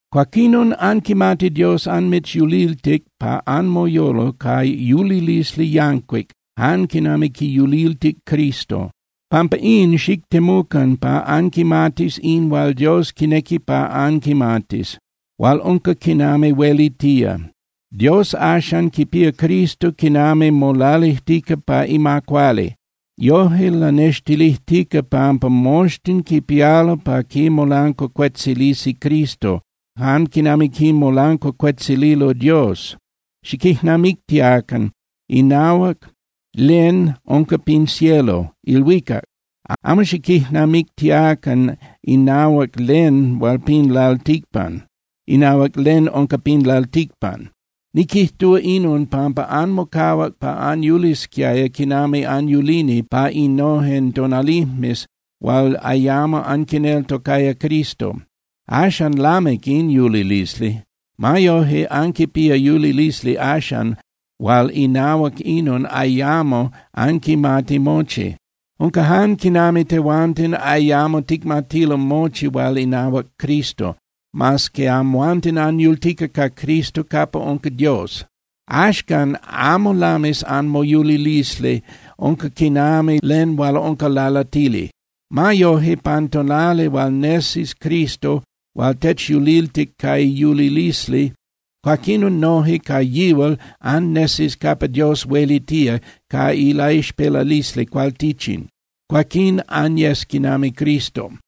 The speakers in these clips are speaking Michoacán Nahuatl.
Cuaquinon, anquimati Dios anmitzyuliltic pa anmoyolo ca yulilisli yancuic jan quinami quiyuliltic Cristo. Pampa in, xictemucan pa anquimatis in hual Dios quinequi pa anquimatis, hual unca quinami huelitía. Dios axan quipía Cristo quinami molalijtica pa ima cuali. Yoje lanextilijtica pampa moxtin quipialo pa quimolancuacuetzilisi Cristo jan quinami quimolancuacuetzililo Dios. Xiquijnamictiacan inahuac len unca pin cielo (ilhuicac), amo xiquijnamictiacan inahuac len unca pin lalticpan. Niquijtúa inon pampa anmocahuac pa anyulisquiaya quinami anyulini pa innojen tonalijmes hual ayamo anquineltocaya Cristo. Axan lamic in yulilisli. Ma yoje anquipía yulilisli axan hual inahuac inon ayamo anquimati mochi. Unca jan quinami tehuanten ayamo ticmatilo mochi hual inahuac Cristo, mas que amhuanten anyultica ca Cristo capa unca Dios. Axcan, amo lamis anmoyulilisli, unca quinami len hual unca lalatili. Ma yoje, pan tonali hual nesis Cristo hual techyuliltic ca iyulilisli, cuaquinon noje ca yihual annesis capa Dios huelitía ca ilaixpelalisli cualtichin. Cuaquín anyes quinami Cristo.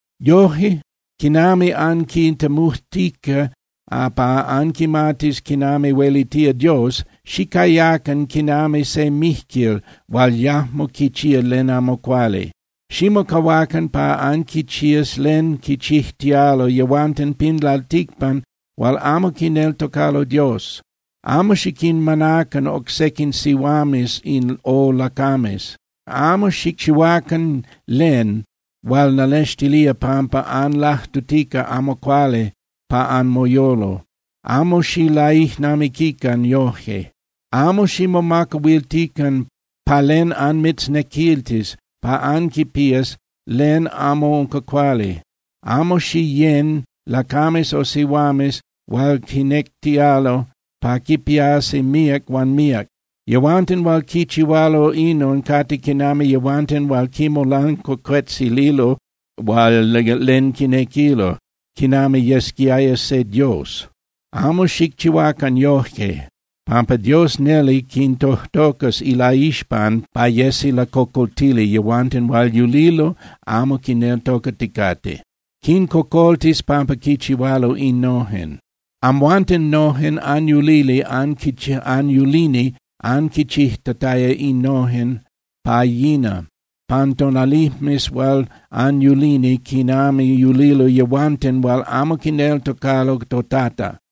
Yoje, quinami anquitemujtica pa anquimatis quinami huelitía Dios, xicayacan quinami se mijquil hual yajmo quichía len amo cuali. Ximocahuacan pa anquichías len quichijtialo yehuanten pin lalticpan hual amo quineltocalo Dios. Amo xiquinmanacan oc sequin sihuames o lacames. Amo xicchihuacan len hual lanextilía pampa anlajtutica amo cuali pa anmoyolo, amo xilaijnamiquican yoje. Amo ximomacahuiltican pa len anmitznequiltis pa anquipías len amo unca cuali. Huan amo xiyén (xiyecan) lacames o sihuames hual quinectialo pa quipiasi míac huan míac. Yehuanten hual quichihualo inon cate quinami yehuanten hual quimolancuacuetzililo hual len quinequilo, quinami yesquiaya se dios. Amo xicchihuacan yoje, pampa Dios neli quintojtocas ilaixpan pa yesi lacocoltili yehuanten hual yulilo amo quineltocaticate. Quincocoltis pampa quinchihualo innojen. Amhuanten nojen anyulini anquichijtataya innojen pa yina pan tonalijmes hual anyulini quinami yulilo yehuanten hual amo quineltocalo toTata.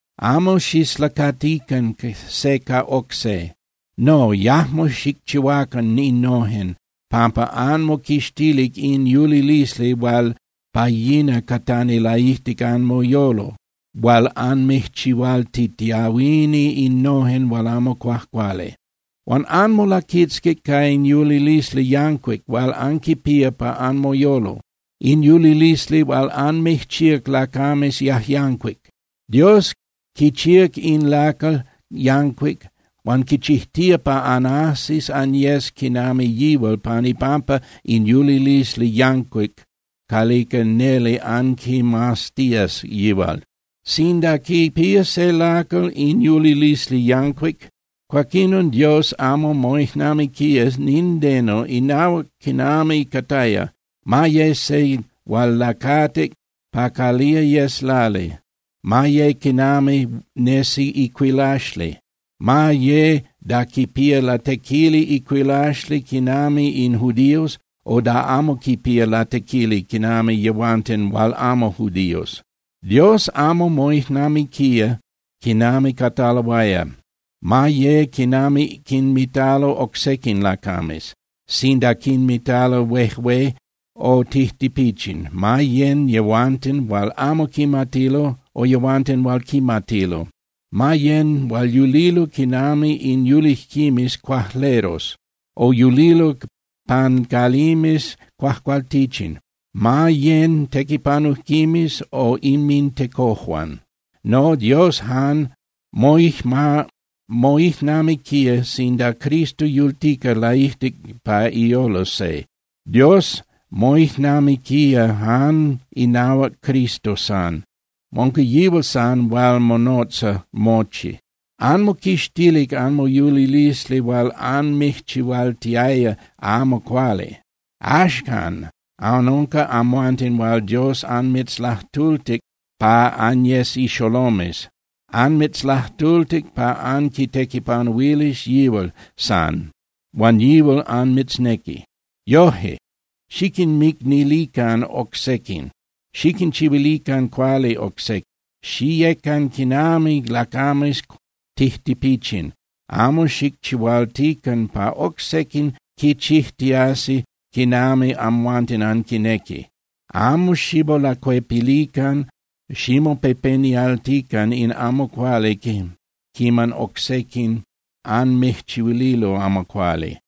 Amo xislacatican se ca oc se. No, yajmo xicchihuacan innojen, pampa anmoquixtilic in yulilisli hual pa yina catani laijtic anmoyolo hual anmijchihualtitiahuini innojen hual amo cuajcuali. Huan anmolaquitzquic ca in yulilisli yancuic hual anquipía pa anmoyolo, in yulilisli hual anmijchíac lacames yajyancuic. Dios quichíac in lacal yancuic huan quichijtía pa anajsis anyes quinami yihual pan ipampa in yulilisli yancuic calica neli anquimaztías yihual. Sinda quipía se lacal in yulilisli yancuic, cuaquinon Dios amo moijnamiquía nindeno inahuac quinami cataya, ma ye se hual lacatic pa calía yes lali, ma ye quinami nesi icuilaxli, ma ye da quipía latequili icuilaxli quinami in judíos, o da amo quipía latequili quinami yehuanten hual amo judíos. Dios amo moijnamiquía quinami cataloaya, ma ye quinami quinmitalo oc sequin lacames, sinda quinmitalo huejué o tijtipichin, ma yén (yecan) yehuanten hual amo quimatilo o yehuanten hual quimatilo, ma yén hual yulilo quinami in yulijquimes cuajleros o yulilo pan calimes cuajcualtichin, ma yén tequipanujquimes o inmintecojuan. No, Dios jan moijnamiquía sinda Cristo yultica laijtic pa iyolo se. Dios moijnamiquía jan inahuac Cristo san, unca yihual san hual monotza mochi. Anmoquixtilic anmoyulilisli hual anmijchihualtiaya amo cuali. Axcan anunca amhuanten hual Dios anmitzlajtultic pa anyes ixolomes. Anmitzlajtultic pa anquitequipanuilis yihual san, huan yihual anmitznequi. Yoje, xiquinmicnilican oc sequin, xiquinchihuilican cuali oc sequin. Xiyecan quinami lacames tijtipichin. Amo xilachihualtican pa oc sequin quichijtiasi quinami amhuanten anquinequi. Amo ximolacuepilican, ximopepenialtican in amo cuali quiman oc sequin anmijchihuililo amo cuali.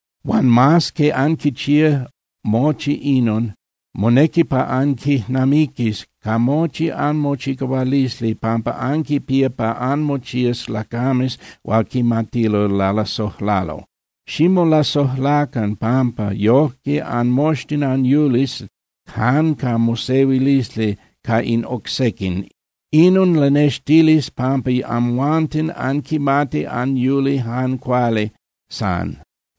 Huan mas que anquichía mochi inon, monequi pa anquijnamiquis ca mochi anmochicahualisli pampa anquipía pa anmochías lacames hual quimatilo lalasojlalo. Ximolasojlacan, pampa yojque anmoxtin anyulis jan ca mosehuilisli ca in oc sequin. Inon lanextilis pampa amhuanten anquimati anyuli jan cuali san.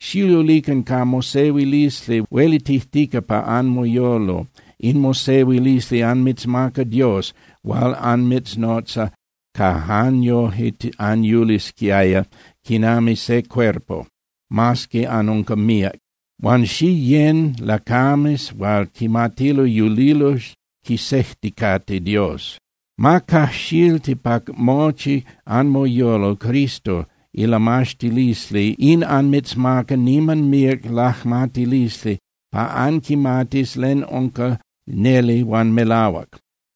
Xiyulican ca mosehuilisli huelitijtica pa anmoyolo. In mosehuilisli anmitzmaca Dios hual anmitznotzac pa jan yoje anyulisquiaya quinami se cuerpo, mas que anunca míac. Huan xiyén (xiyecan) lacames hual quimatilo yulilo quisejticate Dios. Ma cajxilti pa mochi anmoyolo Cristo ilamaxtilisli. In anmitzmaca niman míac lajmatilisli pa anquimatis len unca neli huan melahuac.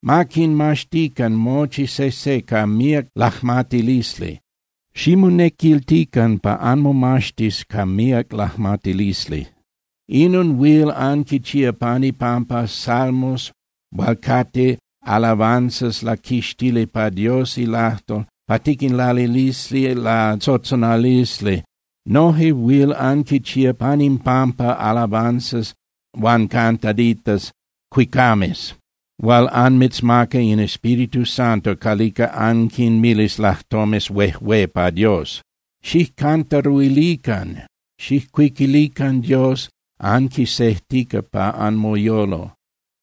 Ma quinmaxtican mochi sejse ca míac lajmatilisli. Ximonequiltican pa anmomaxtis ca míac lajmatilisli. Inon huil anquichía pan ipampa salmos hual cate alabanzas laquixtili pa Dios ilajtol pa tiquinlalilisi latzotzonalisli. Noje huil anquichía pan impampa alabanzas huan cantaditas (cuicames) hual anmitzmaca in Espíritu Santo calica anquinmilis lajtomes huejué pa Dios. Xijcantaruilican (xijcuiquilican) Dios anquisejtica pa anmoyolo.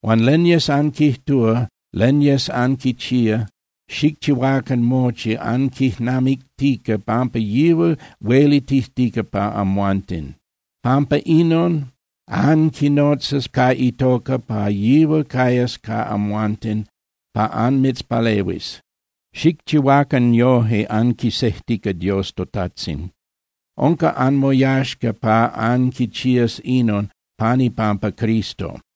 Huan len yes anquijtúa, len yes anquichía, xicchihuacan mochi anquijnamictica pampa yihual huelitijtica pa amhuanten. Pampa inon anquinotzas ca itoca pa yihual cayas ca amhuanten pa anmitzpalehuis. Xicchihuacan yoje anquisejtica Dios toTajtzin. Unca anmoyaxca pa anquichías inon pan ipampa Cristo.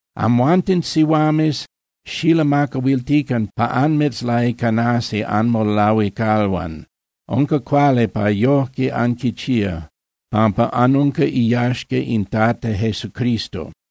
Amhuanten sihuames xilamacahuiltican pa anmitzlaicanasi anmolahuicalhuan. Unca cuali pa yojque anquichías, pampa anunca iyaxca in Tata Jesucristo.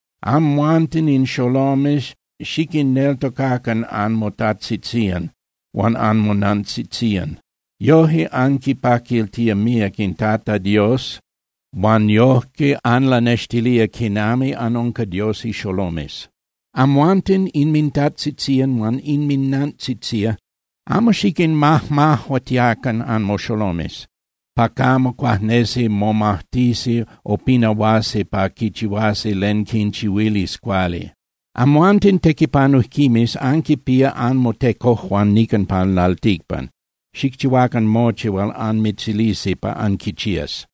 Amhuanten in xolomes xiquinneltocacan anmotajtzitzían huan anmonantzitzían. Yoje anquipaquiltía míac in Tata Dios huan yojque anlanextilía quinami anunca Dios ixolomes. Amhuanten inmintajtzitzían huan inminantzitzían, amo xiquinmajmajuatiacan anmoxolomes, pa camo cuajnesi momajtisi o pinahuasi pa quichihuasi len quinchihuilis cuali. Amhuanten tequipanujquimes anquinpía anmotecojuan nican pin lalticpan. Xicchihuacan mochi hual anmitzilisi pa anquichías.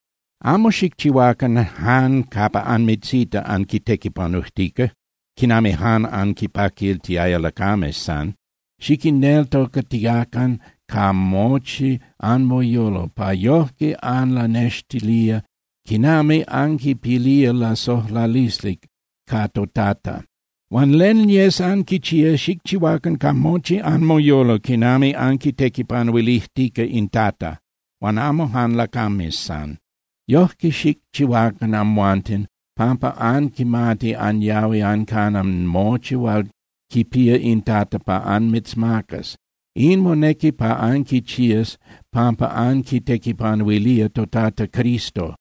Amo xicchihuacan jan capa anmitzita anquitequipanujtica, quinami jan anquinpaquiltiaya lacames san. Xiquinneltocatiacan ca mochi anmoyolo, pa yojque anlanextilía quinami anquipilía lasojlalisli ca toTata. Huan len yes anquichía, xicchihuacan ca mochi anmoyolo quinami anquitequipanuilijtica in Tata, huan amo jan lacames san. Yojque xicchihuacan amhuanten, pampa anquimati anyahui ancana mochi hual quipía in Tata pa anmitzmacas. In monequi pa anquichías pampa anquitequipanuilía toTata Cristo.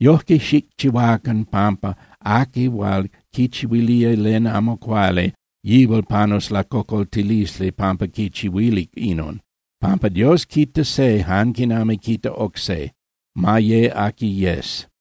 Yojque xicchihuacan pampa aqui hual quichihuilía len amo cuali, yihual panus lacocoltilisli pampa quichihuilic inon, pampa Dios quita se jan quinami quita oc se, ma ye aqui yes.